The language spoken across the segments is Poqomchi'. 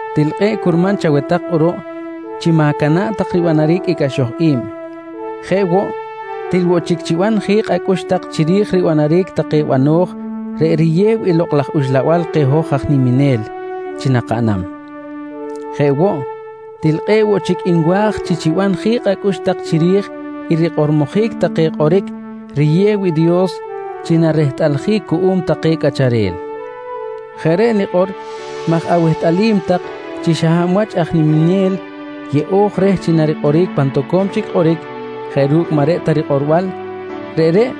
Til kꞌe̱ꞌ curman chaweh tak kꞌuruꞌ chi ma̱cana̱ꞌ tak ribanaric i cꞌaxoj i̱b. Jeꞌ woꞌ, til woꞌ chic chiban ji̱kꞌ acꞌux tak chiri̱j ribanaric take bano̱j reꞌ riyew i Lokꞌ laj Uxlabal keh hoj aj niminel chi nakaꞌnam. Jeꞌ woꞌ, til kꞌe̱ꞌ woꞌ chic nwa̱j chi chiban ji̱kꞌ acꞌux tak chiri̱j i rikꞌormojic take kꞌoric riyew i Dios chi narehtꞌaljic cuꞌum take cꞌacharel. Jeꞌ reꞌ nikꞌor maj awehtꞌalim tak chi xa hab wach aj niminel yeꞌo̱j reh chi narikꞌoric pan toco̱m chic kꞌoric jeꞌ ru̱cꞌ maꞌ reꞌ ta rikꞌorbal, reꞌreꞌ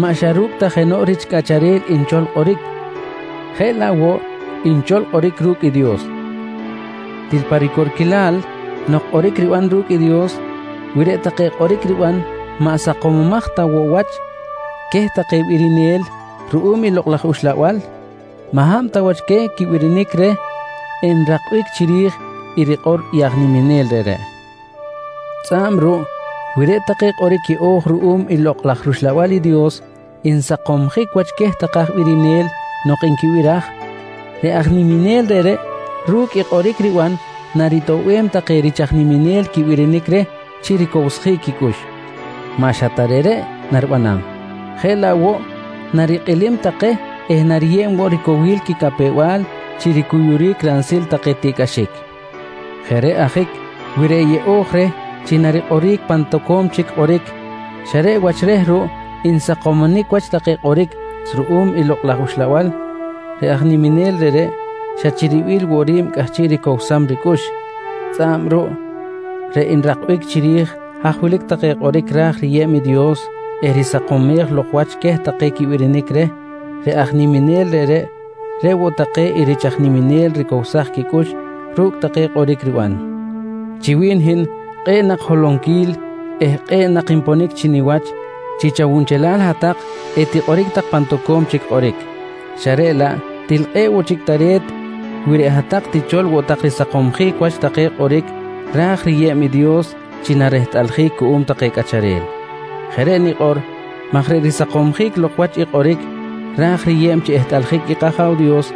maꞌ xa ta ru̱cꞌ jenoꞌ rich cꞌacharel nchol kꞌoric, jeꞌ laꞌ woꞌ nchol kꞌoric ru̱cꞌ i Dios. Til pa ricorquilal nok kꞌoric riban ru̱cꞌ i Dios, wi reꞌ take kꞌoric riban maꞌ jaꞌ sakomomaj ta woꞌ wach queh take birinel ruꞌum i Lokꞌ laj Uxlabal, maꞌ hab ta wach queh quibirinic reh enrakbic chiri̱j i rikꞌor i aj niminel reꞌreꞌ. Tzꞌa̱b ruꞌ wi reꞌ take kꞌoric yeꞌo̱j ruꞌum i Lokꞌ laj rUxlabal i Dios nsakomjic wach queh take aj birinel nok nquibiraj, reꞌ aj niminel reꞌreꞌ ru̱cꞌ kꞌoric riban naritoꞌbem take rich aj niminel quibirinic reh chi ricowsjic quicꞌux. Maꞌ xa ta reꞌreꞌ naribanam, jeꞌ laꞌ woꞌ narikꞌilim take eh nariyeb woꞌ ricowil quicapew-bal chi ricuyuric ransil take tiꞌcꞌaxic. Jeꞌ reꞌ ajic wi reꞌ yeꞌo̱j reh chi narikꞌoric pan tak toco̱m chic kꞌoric xa reꞌ wach reh ruꞌ nsakomjic wach take kꞌoric ruꞌum i Lokꞌ laj Uxlabal, reꞌ aj niminel reꞌreꞌ xa chi ribil woꞌ ri̱b cꞌahchiꞌ ricowsam ricꞌux, tzꞌa̱b ruꞌ reꞌ nrakbic chiri̱j haj wilic take kꞌoric ra̱j riyeb i Dios eh risakomej lok wach queh take quibirinic reh reꞌ aj niminel reꞌreꞌ, reꞌ woꞌ take i rich aj niminel ricowsaj quicꞌux ru̱cꞌ take kꞌoric riban. Chi wi̱n hin kꞌe̱ꞌ nak holonquil eh kꞌe̱ꞌ nak nponic chi niwach chi chawunchelal hat-tak etikꞌoric tak pan tak toco̱m chic kꞌoric, xa reꞌ laꞌ til kꞌe̱ꞌ woꞌ chic tare̱t wi reꞌ hat-tak tichol woꞌ tak risakomsjic wach take kꞌoric ra̱j riyeb i Dios chi narehtꞌaljic cuꞌum take cꞌacharel. Jeꞌ reꞌ nikꞌor maj reꞌ risakomsjic lok wach i kꞌoric ra̱j riyeb chi ehtꞌaljic i kAja̱w Dios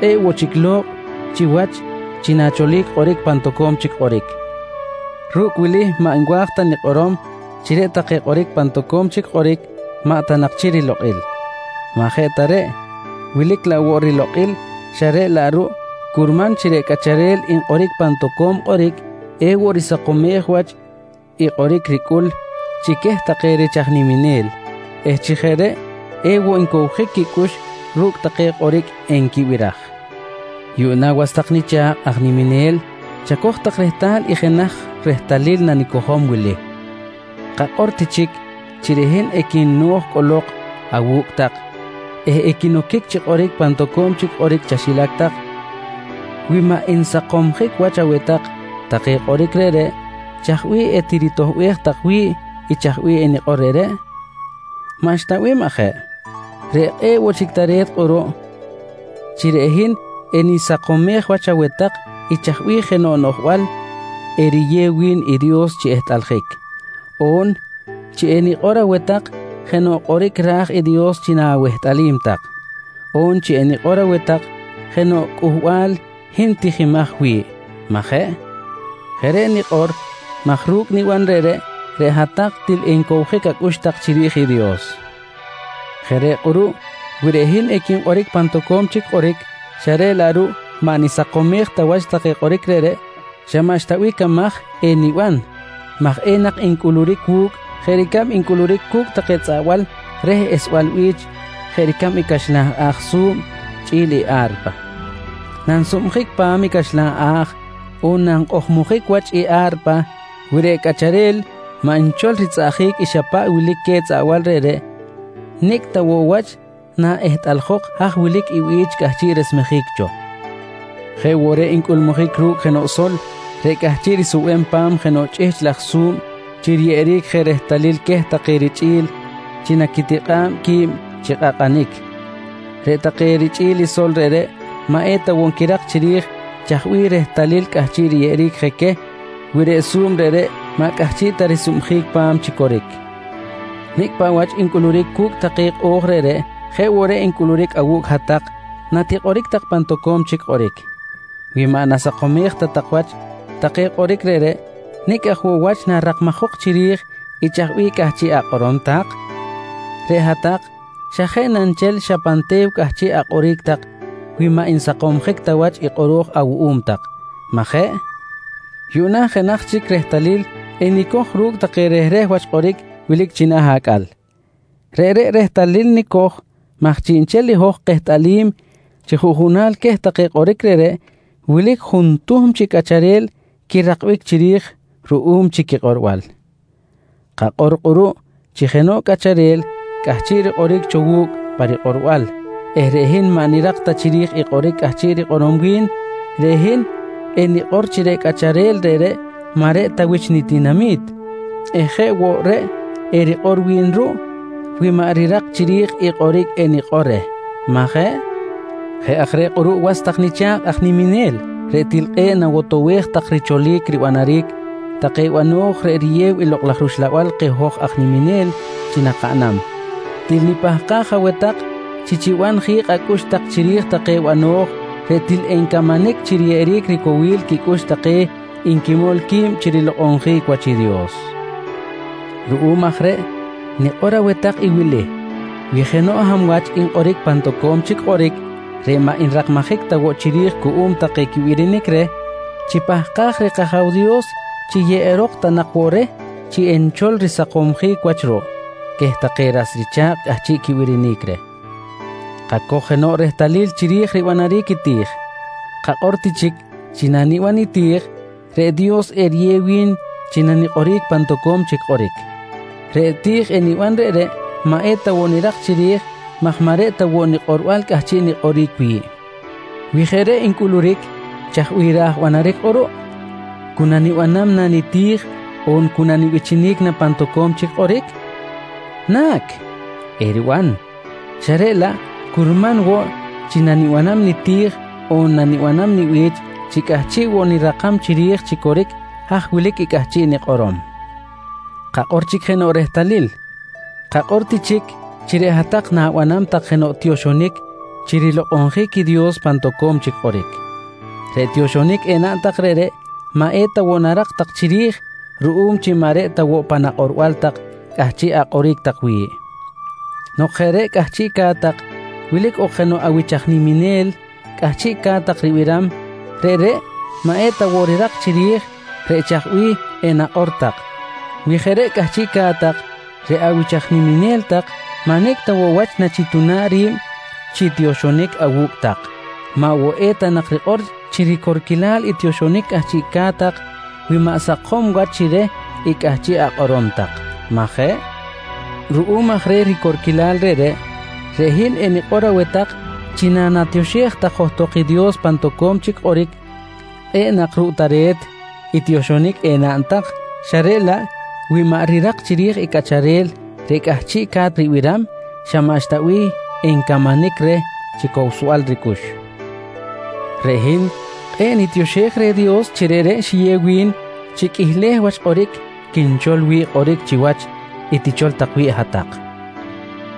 kꞌe̱ꞌ woꞌ chic lokꞌ chiwach chi na̱cholic kꞌoric pan tak toco̱m chic kꞌoric. Ru̱cꞌ wili maꞌ nwa̱j ta nikꞌorom chi reꞌ kꞌoric pan tak toco̱m chic kꞌoric maꞌ ta nak chi rilokꞌil. Maꞌ jeꞌ ta reꞌ, wilic laꞌ woꞌ rilokꞌil xa reꞌ laꞌ ruꞌ curman chi reꞌ cꞌacharel nkꞌoric pan toco̱m kꞌoric ewoꞌ risakomej wach i kꞌoric ricꞌul chi queh take rich aj niminel eh chi jeꞌ reꞌ ewoꞌ ncowjic quicꞌux ru̱cꞌ take kꞌoric enquibiraj. Yuꞌna was tak nicha̱kꞌ aj niminel chacoj tak rehtal i jenaj rehtalil nanicojom wili. Kakꞌor ti chic chi reꞌ hin equino̱j cꞌolok awu̱cꞌ tak eh equinoquic chi kꞌoric pan toco̱m chic kꞌoric chaxilac tak. Wi maꞌ nsakomjic wach aweh tak take kꞌoric reꞌreꞌ, chaj bih etiritoꞌbej tak wi̱ꞌ i chaj bih enikꞌor reꞌreꞌ? Maꞌxta bih, majeꞌ? Reꞌ kꞌe̱ꞌ woꞌ chic tare̱t kꞌuruꞌ chi reꞌ hin enisakomej wach aweh tak i chaj bih jenoꞌ noꞌjbal eriyew wi̱n i Dios chi ehtꞌaljic, on chi enikꞌor aweh tak jenoꞌ kꞌoric ra̱j i Dios chi na̱wehtꞌalim tak, on chi enikꞌor aweh tak jenoꞌ cꞌuhbal hin tijimaj wi̱ꞌ, majeꞌ? Jeꞌ reꞌ nikꞌor maj ru̱cꞌ niban reꞌreꞌ, reꞌ hat-tak til encowjic acꞌux tak chiri̱j i Dios. Jeꞌ reꞌ kꞌuruꞌ wi reꞌ hin equinkꞌoric pan toco̱m chic kꞌoric xa reꞌ laꞌ ruꞌ maꞌ nisakomej wach take kꞌoric reꞌreꞌ, xa maꞌxta bih camaj eniban maj enak ncꞌuluric wu̱cꞌ jeꞌ ricab ncꞌuluric cu̱cꞌ take tzꞌaꞌbal reh esbal bi̱ch jeꞌ ricab i caxlan a̱j su̱b chꞌi̱l i a̱rpa. Nansubjic pa̱m i caxlan a̱j on nankꞌojmojic wach i a̱rpa, wi reꞌ cꞌacharel maꞌ nchol ritzꞌaꞌjic i xa paꞌ wilic queh tzꞌaꞌbal reꞌreꞌ, nicꞌ ta woꞌ wach naꞌehtꞌaljok haj wilic i bi̱ch cꞌahchiꞌ resmejic cho. Jeꞌ woꞌ reꞌ ncꞌulmujic ru̱cꞌ jenoꞌ sol reꞌ cꞌahchiꞌ risubem pa̱m jenoꞌ chꞌihchꞌ laj su̱b chi riyeꞌeric je rehtalil queh take richꞌi̱l chi naquitikꞌa̱b qui̱b chi kꞌakꞌanic. Reꞌ take richꞌi̱l i sol reꞌreꞌ maꞌ eta woꞌ nquirak chiri̱j chaj bih rehtalil cꞌahchiꞌ riyeꞌeric je queh wi reꞌ su̱b reꞌreꞌ maꞌ cꞌahchiꞌ ta risubjic pa̱m chi coric. Nicꞌ paꞌ wach ncꞌuluric cu̱cꞌ take kꞌo̱j reꞌreꞌ, jeꞌ woꞌ reꞌ ncꞌuluric awu̱cꞌ hat-tak natikꞌoric tak pan toco̱m chic kꞌoric. Wi maꞌ nasakomej ta tak wach take kꞌoric reꞌreꞌ, nicꞌ aj woꞌ wach narakmajok chiri̱j i chaj bih cꞌahchiꞌ akꞌorom tak? Reꞌ hat-tak xa jeꞌ na nchel xa pan te̱w cꞌahchiꞌ akꞌoric tak wi maꞌ nsakomjic ta wach i kꞌoro̱j awuꞌum tak, majeꞌ? Yuꞌna jenaj chic rehtalil enicoj ru̱cꞌ take rehreh wach kꞌoric wilic china̱ acꞌal. Reꞌreꞌ rehtalil nicoj maj chiꞌnchel i hoj kehtꞌalim chi juꞌjunal queh take kꞌoric reꞌreꞌ, wilic juꞌjun tuhm chi cꞌacharel quirakbic chiri̱j ruꞌum chi quikꞌorbal. Kakꞌor kꞌuruꞌ chi jenoꞌ cꞌacharel cꞌahchiꞌ rikꞌoric cho wu̱cꞌ parikꞌorbal eh reꞌ hin maꞌ nirak ta chiri̱j i kꞌoric cꞌahchiꞌ rikꞌorom wi̱n, reꞌ hin enikꞌor chi reꞌ cꞌacharel reꞌreꞌ maꞌ reꞌ ta wich nitinami̱t eh jeꞌ woꞌ reꞌ erikꞌor wi̱n ruꞌ wi maꞌ rirak chiri̱j i kꞌoric enikꞌor reh, majeꞌ? Jeꞌ aj reꞌ kꞌuruꞌ was tak nicha̱kꞌ aj niminel reꞌ til kꞌe̱ꞌ nawotowej tak richolic ribanaric take bano̱j reꞌ riyew i Lokꞌ laj Uxlabal keh hoj aj niminel chi nakaꞌnam, til nipahkaj aweh tak chi chiban ji̱kꞌ acꞌux tak chiri̱j take bano̱j reꞌ til encamanic chi riyeꞌeric ricowil quicꞌux take nquimol qui̱b chi rilokꞌonjic wach i Dios. Ruꞌum aj reꞌ nikꞌor aweh tak i wili: Wi jenoꞌ hab wach nkꞌoric pan toco̱m chic kꞌoric reꞌ maꞌ nrakmajic ta woꞌ chiri̱j cuꞌum take quibirinic reh, chipahkaj reh kAja̱w Dios chi yeꞌerok ta nak woꞌ reh chi nchol risakomsjic wach ruꞌ queh take ras richa̱kꞌ cꞌahchiꞌ quibirinic reh. Kacoj jenoꞌ rehtalil chiri̱j ribanaric i ti̱j. Kakꞌor ti chic chi naniban niti̱j, reꞌ Dios eriyew wi̱n chi nanikꞌoric pan toco̱m chic kꞌoric. Reꞌ ti̱j eniban reꞌreꞌ maꞌ eta woꞌ nirak chiri̱j maj maꞌ reꞌ ta woꞌ nikꞌorbal cꞌahchiꞌ nikꞌoric wi̱ꞌ. Wi jeꞌ reꞌ ncꞌuluric, chaj bih ra̱j banaric kꞌuruꞌ? Cu nanibanam na niti̱j on cu nanibichinic na pan toco̱m chic kꞌoric? Na̱c, eriban xa reꞌ laꞌ curman woꞌ chi nanibanam niti̱j on nanibanam nibi̱ch chi cꞌahchiꞌ woꞌ nirakam chiri̱j chi coric haj wilic i cꞌahchiꞌ nikꞌorom. Kacoj chic jenoꞌ rehtalil. Kakꞌor ti chic chi reꞌ hat-tak na̱banam tak jenoꞌ tioxonic chi rilokꞌonjic i Dios pan toco̱m chic kꞌoric. Reꞌ tioxonic enaꞌn tak reꞌreꞌ maꞌ eta woꞌ narak tak chiri̱j ruꞌum chi maꞌ reꞌ ta woꞌ pan akꞌorbal tak cꞌahchiꞌ akꞌoric tak wi̱ꞌ. Nok jeꞌ reꞌ cꞌahchiꞌca̱t tak wilic ok jenoꞌ awich aj niminel cꞌahchiꞌca̱t tak ribiram, reꞌreꞌ maꞌ eta woꞌ rirak chiri̱j reꞌ chaj bih enakꞌor tak. Wi jeꞌ cꞌahchiꞌca̱t tak reꞌ awich aj niminel tak maꞌ nicꞌ ta woꞌ wach nachituna̱ꞌ ri̱b chi tioxonic awu̱cꞌ tak, maꞌ woꞌ eta nak rikꞌor chi ricorquilal i tioxonic cꞌahchiꞌca̱t tak wi maꞌ sakom wach chi reh i cꞌahchiꞌ akꞌorom tak majeꞌ? Ruꞌum aj reh ricorquilal reꞌreꞌ, reꞌ hin enikꞌor aweh tak chi nanatioxej johtok i Dios pan toco̱m chic kꞌoric, kꞌe̱ꞌ nak ruꞌ tare̱t i tioxonic enaꞌn tak xa reꞌ laꞌ wi maꞌ rirak chiri̱j i cꞌacharel reꞌ cꞌahchiꞌca̱t ribiram xa maꞌxta bih encamanic reh chi cowsbal ricꞌux. Reꞌ hin kꞌe̱ꞌ nitioxej reh Dios chi reꞌreꞌ xiyew wi̱n chi qꞌuihleh wach kꞌoric quinchol wi̱ꞌ kꞌoric chiwach i tichol tak wi̱ꞌ hat-tak,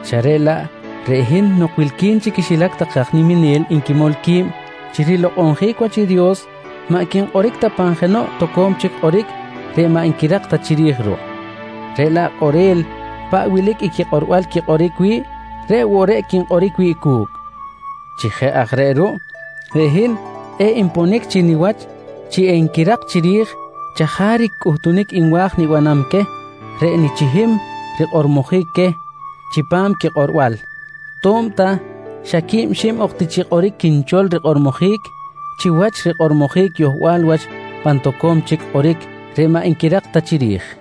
xa reꞌ laꞌ reꞌ hin nok wilqui̱n chi quixilac take aj niminel nquimol qui̱b chi rilokꞌonjic wach i Dios maꞌ quinkꞌoric ta pan jenoꞌ toco̱m chic kꞌoric reꞌ maꞌ nquirak ta chiri̱j ruꞌ, reꞌ laꞌ kꞌorel paꞌ wilic i quikꞌorbal quikꞌoric wi̱ꞌ, reꞌ woꞌ reꞌ quinkꞌoric wi̱ꞌ cu̱cꞌ. Chi jeꞌ aj reꞌ ruꞌ, reꞌ hin kꞌe̱ꞌ nponic chi niwach chi enquirak chiri̱j chajaric cꞌuhtunic nwa̱j nibanam queh reꞌ nichihim rikꞌormojic queh chipam quikꞌorbal, to̱b ta xa quib xib ok ti chi kꞌoric quinchol rikꞌormojic chiwach rikꞌormojic yohbal wach pan toco̱m chic kꞌoric reꞌ maꞌ nquirak ta chiri̱j.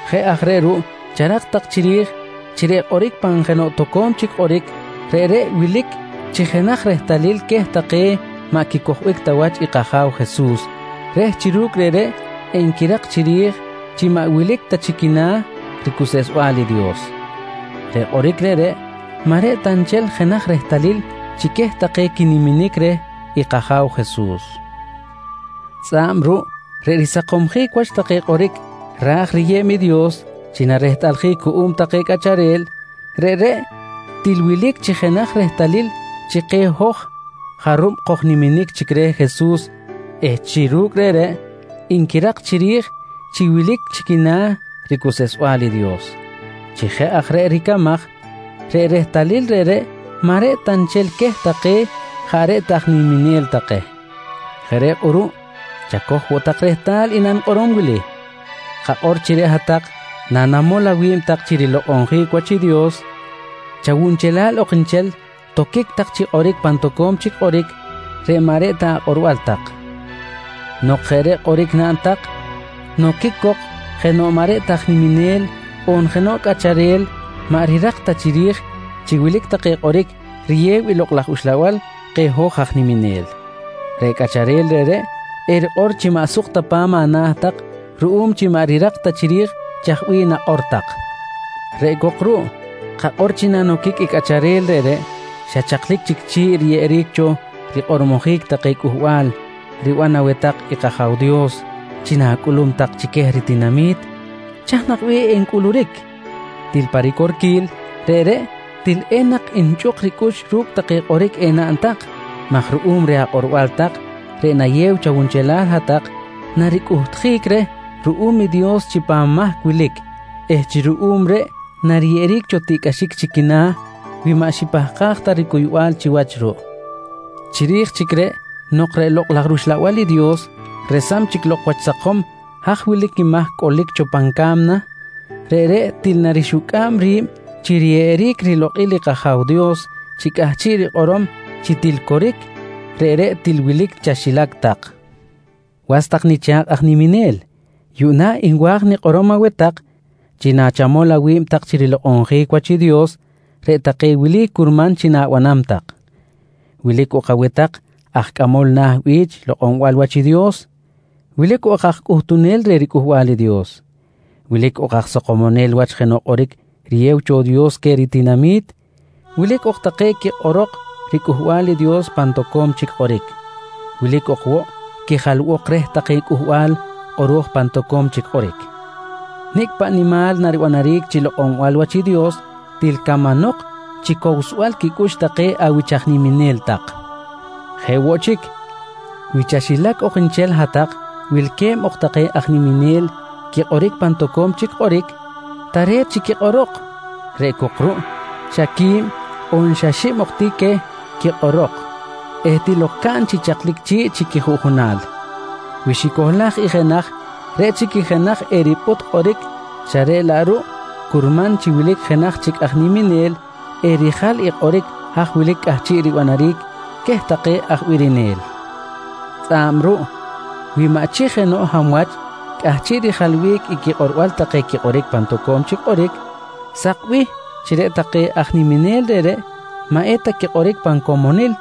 Jeꞌ aj reꞌ ruꞌ charak tak chiri̱j chi reꞌ kꞌoric pan jenoꞌ toco̱m chic kꞌoric, reꞌreꞌ wilic chi jenaj rehtalil queh take maꞌ quicojbic ta wach i kAja̱w Jesus reh chi ru̱cꞌ reꞌreꞌ enquirak chiri̱j chi maꞌ wilic ta chi quina̱ ricuseꞌsbal i Dios. Reꞌ kꞌoric reꞌreꞌ maꞌ reꞌ ta nchel jenaj rehtalil chi queh take quinimanic reh i kAja̱w Jesus. Tzꞌa̱b ruꞌ reꞌ risakomsjic wach take kꞌoric ra̱j riyeb i Dios chi narehtꞌaljic cuꞌum take cꞌacharel, reꞌreꞌ til wilic chi jenaj rehtalil chi keh hoj jarub kojniminic chic reh Jesus eh chi ru̱cꞌ reꞌreꞌ nquirak chiri̱j chi wilic chi quina̱ ricuseꞌsbal i Dios. Chi jeꞌ aj reꞌ ricamaj, reꞌ rehtalil reꞌreꞌ maꞌ reꞌ ta nchel queh take jaꞌ reꞌ ta aj niminel take. Jeꞌ reꞌ kꞌuruꞌ chacoj woꞌ tak rehtal i nanikꞌorom wili: Kakꞌor chi reꞌ hat-tak nanamol awi̱b tak chi rilokꞌonjic wach i Dios, chawunchelal ok nchel toquic tak chi kꞌoric pan toco̱m chic kꞌoric reꞌ maꞌ reꞌ ta akꞌorbal tak. Nok jeꞌ reꞌ kꞌoric naꞌn tak noquic cok jenoꞌ maꞌ reꞌ ta aj niminel on jenoꞌ cꞌacharel maꞌ rirak ta chiri̱j chi wilic take kꞌoric riyew i Lokꞌ laj Uxlabal keh hoj aj niminel. Reꞌ cꞌacharel reꞌreꞌ erikꞌor chi maꞌ suk ta pa̱m ana̱ tak ruꞌum chi maꞌ rirak ta chiri̱j chaj bih nakꞌor tak. Reꞌ cok ruꞌ kakꞌor chi nanoquic cok i cꞌacharel reꞌreꞌ, xa chaklic chic chi̱ꞌ riyeꞌeric cho rikꞌormojic take cꞌuhbal riban aweh tak i kAja̱w Dios chi na̱cꞌulum tak chi queh ritinami̱t, chaj nak bih encꞌuluric? Til pa ricorquil, reꞌreꞌ til enak nchꞌuk ricꞌux ru̱cꞌ take kꞌoric enaꞌn tak maj ruꞌum reh akꞌorbal tak reꞌ nayew chawunchelal hat-tak, naricꞌuhtjic reh ruꞌum i Dios chi pan mahc wilic eh chi ruꞌum reꞌ nariyeꞌeric cho tiꞌcꞌaxic chi quina̱ wi maꞌ xipahkaj ta ricuybal chiwach ruꞌ. Chiri̱j chic reꞌ nok reꞌ i Lokꞌ laj rUxlabal i Dios resam chic lok wach sakom haj wilic i mahc cꞌolic cho pan ca̱mna, reꞌreꞌ til narixucꞌa̱b ri̱b chi riyeꞌeric rilokꞌil i kAja̱w Dios chi cꞌahchiꞌ rikꞌorom chi til coric, reꞌreꞌ til wilic chaxilac tak. Was tak nicha̱kꞌ aj niminel, yuꞌna nwa̱j nikꞌorom aweh tak chi nachamol awi̱b tak chi rilokꞌonjic wach i Dios reꞌ take wili curman chi na̱banam tak: Wilic ok aweh tak aj cꞌamol na̱ bi̱ch lokꞌonbal wach i Dios. Wilic ok aj cꞌuhtunel reh riCꞌuhbal i Dios. Wilic ok aj sakomonel wach jenoꞌ kꞌoric riyew cho Dios queh ritinami̱t. Wilic ok take quikꞌorok riCꞌuhbal i Dios pan toco̱m chic kꞌoric. Wilic ok woꞌ quijalbok reh take cꞌuhbal kꞌoro̱j pan toco̱m chic kꞌoric. Nicꞌ paꞌ nimal naribanaric chi lokꞌonbal wach i Dios til camanok chi cowsbal quicꞌux take awich aj niminel tak. Jeꞌ woꞌ chic, wi chaxilac ok nchel hat-tak wilque̱b ok take aj niminel quikꞌoric pan toco̱m chic kꞌoric, tare̱t chi quikꞌorok, reꞌ cok ruꞌ xa quib on xa xib ok ti queh quikꞌorok eh til ok caꞌn chi chaklic chi̱ꞌ chi quijuꞌjunal. Wi xicohlaj i jenaj, reꞌ chic i jenaj eripꞌut kꞌoric xa reꞌ laꞌ ruꞌ curman chi wilic jenaj chic aj niminel erijal i kꞌoric haj wilic cꞌahchiꞌ ribanaric queh take aj birinel. Tzꞌa̱b ruꞌ wi maꞌ chi jenoꞌ hab wach cꞌahchiꞌ rijalbic i quikꞌorbal take quikꞌoric pan toco̱m chic kꞌoric, sakbih chi reꞌ take aj niminel reꞌreꞌ maꞌ eta quikꞌoric pan comonil,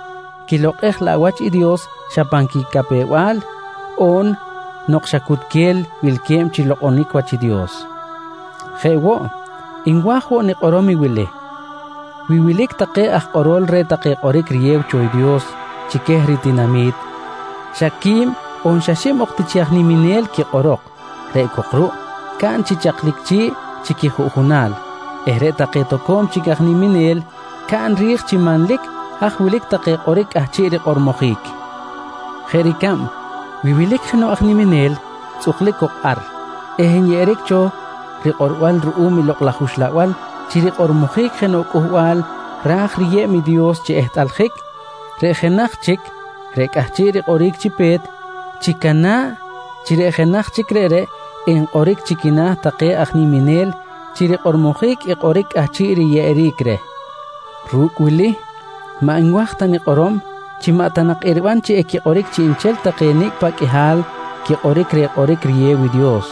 quilokꞌej laꞌ wach i Dios xa pan quicapew-bal on nok xa cutquel wilque̱b chi lokꞌonic chiwach i Dios. Jeꞌ woꞌ nwa̱j woꞌ nikꞌorom i wili: Wi wilic take aj kꞌorol reh take kꞌoric riyew cho i Dios chi queh ritinami̱t, xa quib on xib ok ti chi aj niminel quikꞌorok reꞌ cok ruꞌ caꞌn chi chaklic chi̱ꞌ chi quijuꞌjunal eh reꞌ take toco̱m chic aj niminel caꞌn ri̱j chi manlic haj wilic take kꞌoric cꞌahchiꞌ rikꞌormojic. Jeꞌ ricab wi wilic jenoꞌ aj niminel tzꞌuklic cok ar eh enyeꞌeric cho rikꞌorbal ruꞌum i Lokꞌ laj Uxlabal chi rikꞌormojic jenoꞌ cꞌuhbal ra̱j riyeb i Dios chi ehtꞌaljic, reꞌ jenaj chic reꞌ cꞌahchiꞌ rikꞌoric chi pe̱t, chicana̱ꞌ chi reꞌ jenaj chic reꞌreꞌ enkꞌoric chi quina̱ take aj niminel chi rikꞌormojic i kꞌoric cꞌahchiꞌ riyeꞌeric reh. Ru̱cꞌ wili maꞌ nwa̱j ta nikꞌorom chi maꞌ ta nak eriban chi equikꞌoric chiꞌnchel take nicꞌ paꞌ qꞌuihal quikꞌoric reh kꞌoric riyew cho i Dios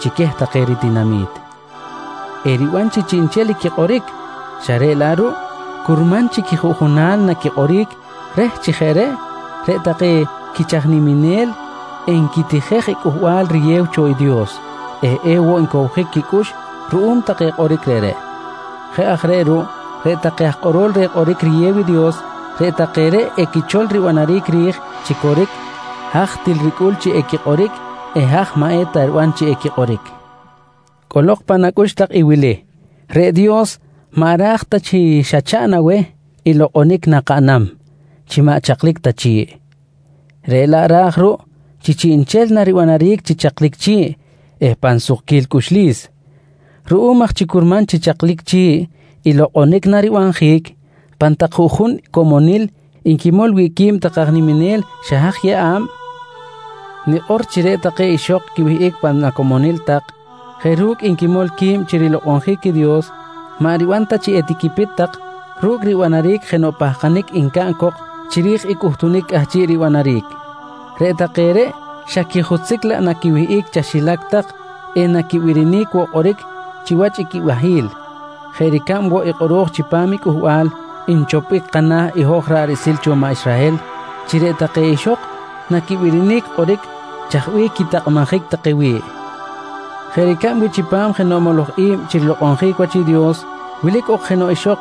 chi queh take ritinami̱t. Eriban chi chiꞌnchel equikꞌoric xa reꞌ laꞌ ruꞌ curman chi quijuꞌjunal naquikꞌoric reh chi jeꞌ reꞌ, reꞌ take quich aj niminel enquitijej i cꞌuhbal riyew cho i Dios eh ewoꞌ ncowjic quicꞌux ruꞌum reh take kꞌoric reꞌreꞌ. Jeꞌ aj reꞌ ruꞌ, reꞌ take aj kꞌorol reh kꞌoric riyew i Dios, reꞌ take reꞌ equichol ribanaric ri̱j chi coric haj til ricꞌul chi equikꞌoric eh haj maꞌ eta riban chi equikꞌoric. Cꞌolok pan acꞌux tak i wili: Reꞌ Dios maꞌ ra̱j ta chi xa chaꞌn aweh i lokꞌonic nakaꞌnam chi maꞌ chaklic ta chi̱ꞌ. Reꞌ laꞌ ra̱j ruꞌ chi chiꞌnchel naribanaric chi chaklic chi̱ꞌ eh pan sukquil cꞌuxlis. Ruꞌum aj chi curman chi chaklic chi̱ꞌ i lokꞌonic naribanjic pan tak juꞌjun comonil nquimol wi̱ꞌ qui̱b take aj niminel xa haj yeꞌa̱b, nikꞌor chi reꞌ take ixok quiwihꞌic pan acomonil tak jeꞌ ru̱cꞌ nquimol qui̱b chi rilokꞌonjic i Dios, maꞌ riban ta chi etiquipit tak ru̱cꞌ ribanaric jenoꞌ pahkanic encaꞌn cok chiri̱j i cꞌuhtunic cꞌahchiꞌ ribanaric. Reꞌ take reꞌ xa quijutzic laꞌ naquiwihꞌic chaxilac tak eh naquibirinic woꞌ kꞌoric chiwach i quibahi̱l jeꞌ ricab woꞌ i kꞌoro̱j chipam i cꞌuhbal nchopbic kana̱ i hoj ra̱ꞌ riꞌsil cho maꞌ Israhel chi reꞌ take ixok naquibirinic kꞌoric ru̱cꞌ chaj bih quitakꞌmajic take wi̱ꞌ. Jeꞌ ricab wi chipam jenoꞌ moloj i̱b chi rilokꞌonjic wach i Dios wilic ok jenoꞌ ixok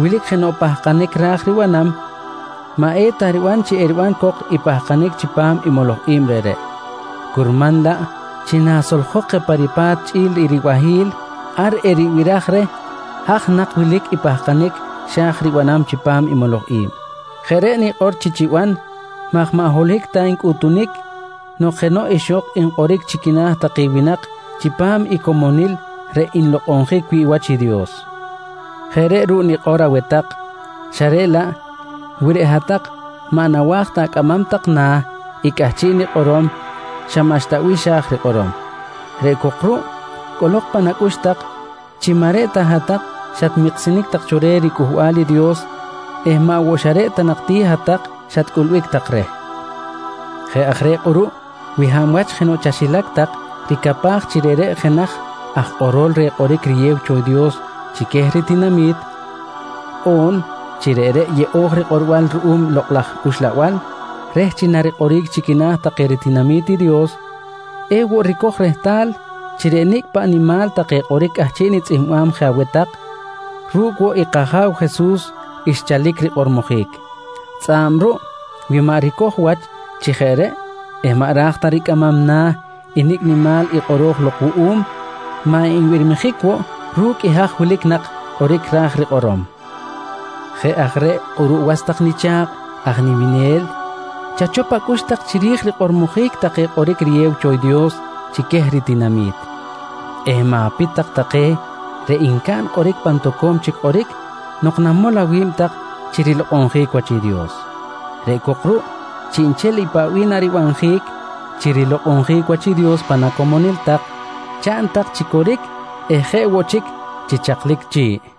wilic jenoꞌ pahkanic ra̱j ribanam, maꞌ eta riban chi eriban cok i pahkanic chipam i moloj i̱b reꞌreꞌ, curman laꞌ chi nasoljok je pa ripa̱t chꞌi̱l i ribahi̱l, ar eribiraj reh haj nak wilic i pahkanic xa̱j ribanam chipam i moloj i̱b. Jeꞌ reꞌ nikꞌor chi chiban maj maꞌ holohic ta ncꞌutunic nok jenoꞌ ixok nkꞌoric chi quina̱ take winak chipam i comonil reꞌ nlokꞌonjic wi̱ꞌ wach i Dios. Jeꞌ reꞌ ruꞌ nikꞌor aweh tak xa reꞌ laꞌ wi reꞌ hat-tak maꞌ nawa̱j ta acꞌamam tak na̱ i cꞌahchiꞌ nikꞌorom xa maꞌxta bih xa̱j rikꞌorom. Reꞌ cok ruꞌ cꞌolok pan acꞌux tak chi maꞌ reꞌ ta hat-tak xatmiksinic tak cho reh riCꞌuhbal i Dios eh maꞌ woꞌ xa reꞌ ta nak ti hat-tak xatcꞌulbic tak reh. Jeꞌ aj reꞌ kꞌuruꞌ wi hab wach jenoꞌ chaxilac tak ricapaj chi reꞌreꞌ jenaj aj kꞌorol reh kꞌoric riyew cho i Dios chi queh ritinami̱t, on chi reꞌreꞌ yeꞌo̱j rikꞌorbal ruꞌum i Lokꞌ laj Uxlabal reh chi narikꞌoric chi quina̱ take ritinami̱t i Dios, ewoꞌ ricoj rehtal chi reꞌ nicꞌ paꞌ nimal take kꞌoric cꞌahchiꞌ nitzꞌihmbam je aweh tak, ru̱cꞌ woꞌ i kAja̱w Jesus xchalic rikꞌormojic. Tzꞌa̱b ruꞌ wi maꞌ ricoj wach chi jeꞌ reꞌ eh maꞌ ra̱j ricꞌamam na̱ i nicꞌ nimal i kꞌoro̱j lok wuꞌum, maꞌ nbirmijic woꞌ ru̱cꞌ i haj wilic nak kꞌoric ra̱j rikꞌorom. Jeꞌ aj reꞌ kꞌuruꞌ was tak nicha̱kꞌ aj niminel, chachop acꞌux tak chiri̱j i rikꞌormojic take kꞌoric riyew cho Dios chi queh i ritinami̱t eh ma̱pit tak take reꞌ ncaꞌn kꞌoric pan toco̱m chic kꞌoric nok namol awi̱b tak chi rilokꞌonjic wach i Dios. Reꞌ cok ruꞌ chiꞌnchel i paꞌ bih naribanjic chi rilokꞌonjic wach i Dios pan acomonil tak, chaꞌn tak chi coric eh jeꞌ woꞌ chic chi chaklic chi̱ꞌ.